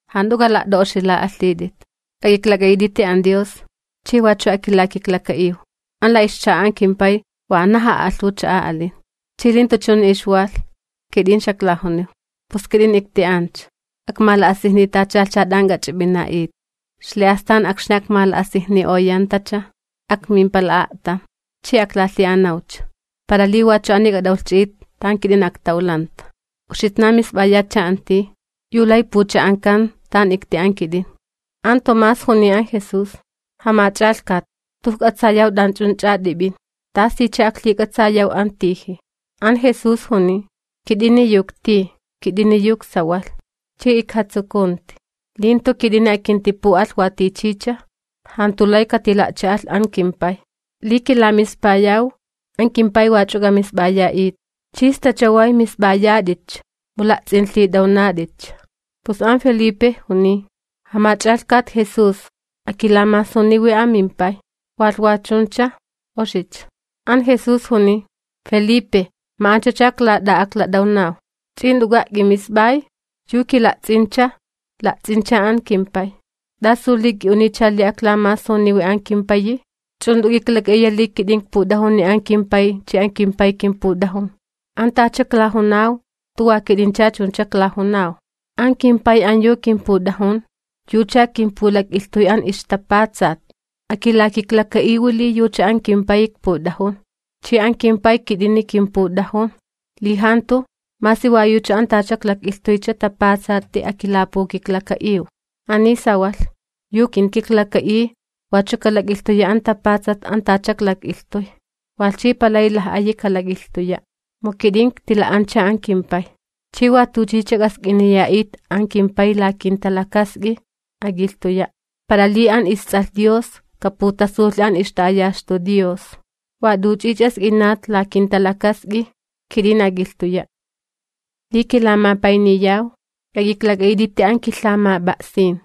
’Jant'u k'ala't'a'oxila'alhit'it, k'ak'iklak'a'it'iti an Dios chi wachu akilakiklaka'iw. An la ixcha'a an kimPay wanaj a'alhuwi cha'a alin, li jantu chuni ixwalh, kit'in xaklajuniw. Pus kit'in ikti'ancha, akmala'asijnitachalhcha t'an k'ach'ip'ina'it. Ixli'astan akxni akmala'asijni'oyantacha, akmimpala a'tam, chi aklalhi'anawcha, para li wachu ani k'at'awlhchi'it tan kit'in aktawlanta. Uxitnan misp'ayatcha an tij yu lay pucha'ankan tan ikti'an kit'in. An Tomás juniy an Jesús: ―Jamach'alhkat, jantu ijk'atsayaw t'anch'unch'a t'ip'in, ¿tasicha aklhik'atsayaw an tiji? An Jesús juniy: ―Kit'ini yu iktij, kit'ini yu iksawalh, chi ikjatsukunti, li jantu kit'ini akintipu'alh wa tichicha, jantu lay katila'cha'alh an kimPay. Li kilamispayaw, an kimPay wach'u k'amisp'aya'it chi sta chaway misp'ayat'itcha, mu la'ts'inlhit'awnat'itcha. Pus an Felipe juniy: ―Jamach'alhkat Jesús, akilamasuniwi amimPay, walh wa chuncha oxicha. An Jesús juniy: ―Felipe, ma'anchacha iklat'a'aklat'awnaw, ¿ch'i jant'uka' k'imisp'ay? Yu kila'ts'incha, la'ts'incha an kimPay. ¿T'asu li k'i'uniycha li aklamasuniwi an kimPayi? ¿Ch'u jant'u k'iklak'a'iya li kit'in ikput'ajuni an kimPay chi an kimPay kimput'ajun? An tacha iklajunaw jantu wa kit'incha chuncha iklajunaw. An kimPay an yu kimput'ajun, yucha kimpulak'ilhtuy an ixtapatsat. Akilakiklaka'iwi li yucha an kimPayi ikput'ajun, chi an kimPay kit'ini kimput'ajun, li jantu, masi wa yucha an tacha iklak'ilhtuycha tapatsati akilapukiklaka'iw. Ani sawalh, yu kinkiklaka'iy wachu kalak'ilhtuya an tapatsat an tacha iklak'ilhtuy. Walh chi palay laj'ayi kalak'ilhtuya', mu kit'in iktila'ancha an kimPay. Ch'i wa t'uch'ich'a k'ask'iniya'it an kimPay la kinta'a'ut, ak'ilhtuya', para li an isTs'alh Dios kaputasulhi an ixta'ayaxtu Dios. Wa t'uch'ich'a sk'inat la kinta'a'ut, kit'in ak'ilhtuya'. ’Li kilamapayniyaw, k'ak'iklak'a'it'iti an kilhamap'a'sin.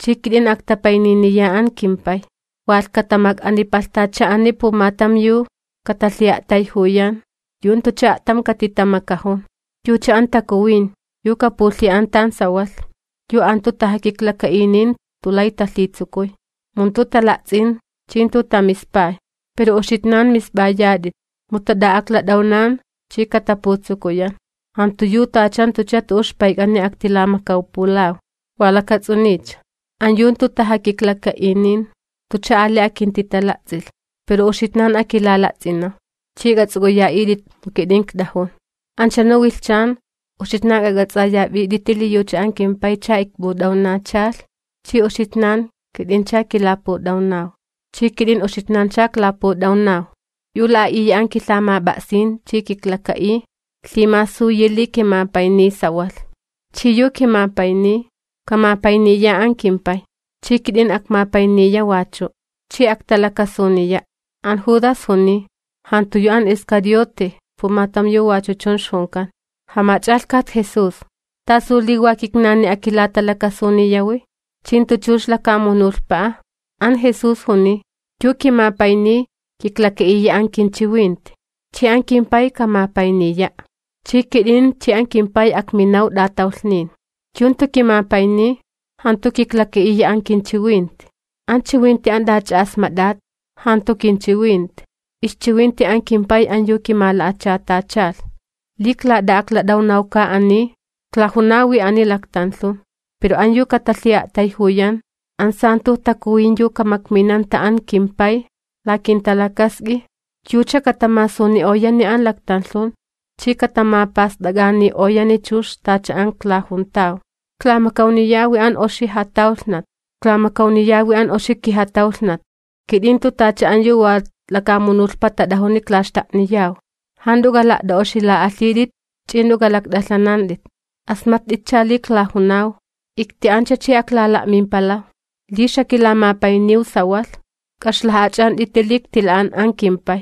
Chi kit'in aktapayniniya an kimPay, walh katamak'anipalhtacha'ani pumatam yu katalhi'a'tayjuyan, yu jantucha a'tam katitamakajun: yucha an Takuwin yu kapulhi'an tan sawalh, yu an jantu tajakiklaka'inin jantu lay talhitsukuy, mu jantu tala'ts'in chi jantu tamispay. Pero uxitnan misp'ayat'it, mu tat'a'aklat'awnan chi kataputsukuyan. Jantu yu tacha jantucha tu'u ixpayk'ani aktilamakawpulaw. Wa lakats'uniycha, an yu jantu tajakiklaka'inin jantucha ali akintitala'ts'ilh. Pero uxitnan akilala'ts'inaw, ch'i k'ats'uk'uya'it'it mu kit'in ikt'ajun. Anchunu wilhchan, uxitnan k'ak'ats'aya'it'iti li yucha an kimPaycha ikput'awnachalh chi uxitnan kit'incha kilaput'awnaw chi kit'in uxitnancha iklaput'awnaw. Yu la'a'iya an kilhamap'a'sin chi kiklaka'iy, lhimasuyi li kimapayniy sawalh. Chi yu kimapayniy, kamapayniya an kimPay, chi kit'in akmapayniya wachu', chi aktalakasuniya'. An Judas juniy, (jantu yu an Iscariote pumatam yu wachu chun ixjunkan): ―Jamach'alhkat Jesús, ¿tasu li wa kitnani akilatalakasuniyawi, chi jantu chux lakamunulhpa'a? An Jesús juniy: ―Yu kimapayniy, kiklaka'iya an kinchiwinti chi an kimPay kamapayniya'. Chi kit'in chi an kimPay akminaw t'atawlhnin. Yu jantu kimapayniy, jantu kiklaka'iya an kinchiwinti. An chiwinti an t'ach'a asmat'at jantu kinchiwinti, ixchiwinti an kimPay an yu kimala'achatachalh. ’Li iklat'a'aklat'awnawka ani, iklajunawi ani laktanlhun. Pero an yu katalhi'a'tayjuyan, an Stalan'a Takuwin yu kamakminanta an kimPay la kinta'a'ut, yucha katamasuni'oyani an laktanlhun chi katamapast'ak'ani'oyani chux tacha an iklajuntaw. ’Iklamakawniyawi an oxi jatawlhnat, iklamakawniyawi an oxi kijatawlhnat. Kit'in jantu tacha an yu wa lakamunulhpa tat'ajuni iklaxta'niyaw. Jant'u k'ala't'a'oxila'alhit'it ch'i jant'u k'alakt'alhanant'it. Asmatt'itcha li iklajunaw: “Ikti'ancha chi aklala'mimpalaw.” Li xakilamapayniw sawalh, k'a'ixlaj'ach'ant'iti li iktila'an an kimPay,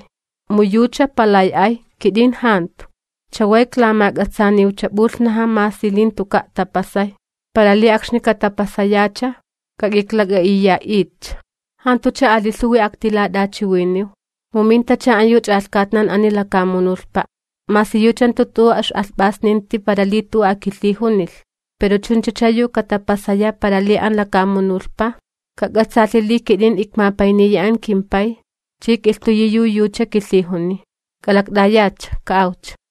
mu yucha palay ay, kit'in jantu. Chaway iklamak'atsaaniwcha p'ulhnaja masi li jantuka' tapasay, para li akxni katapasayacha k'ak'iklak'a'iya'itcha. ’Jantucha ali lhuwi aktilat'achiwiniw, mu mintacha an yu ch'alhkatnan ani lakamunulhpa'. Masi yucha jantu tu'u ix'alhp'asninti para li tu'u akilhijunilh. Pero chunchacha yu katapasaya para li an lakamunulhpa kak'atsaalhi li kit'in ikmapayniya an kimPay chi ik'ilhtuyi yu yucha kilhijuniy. ¡K'alakt'ayatcha, ka'awcha!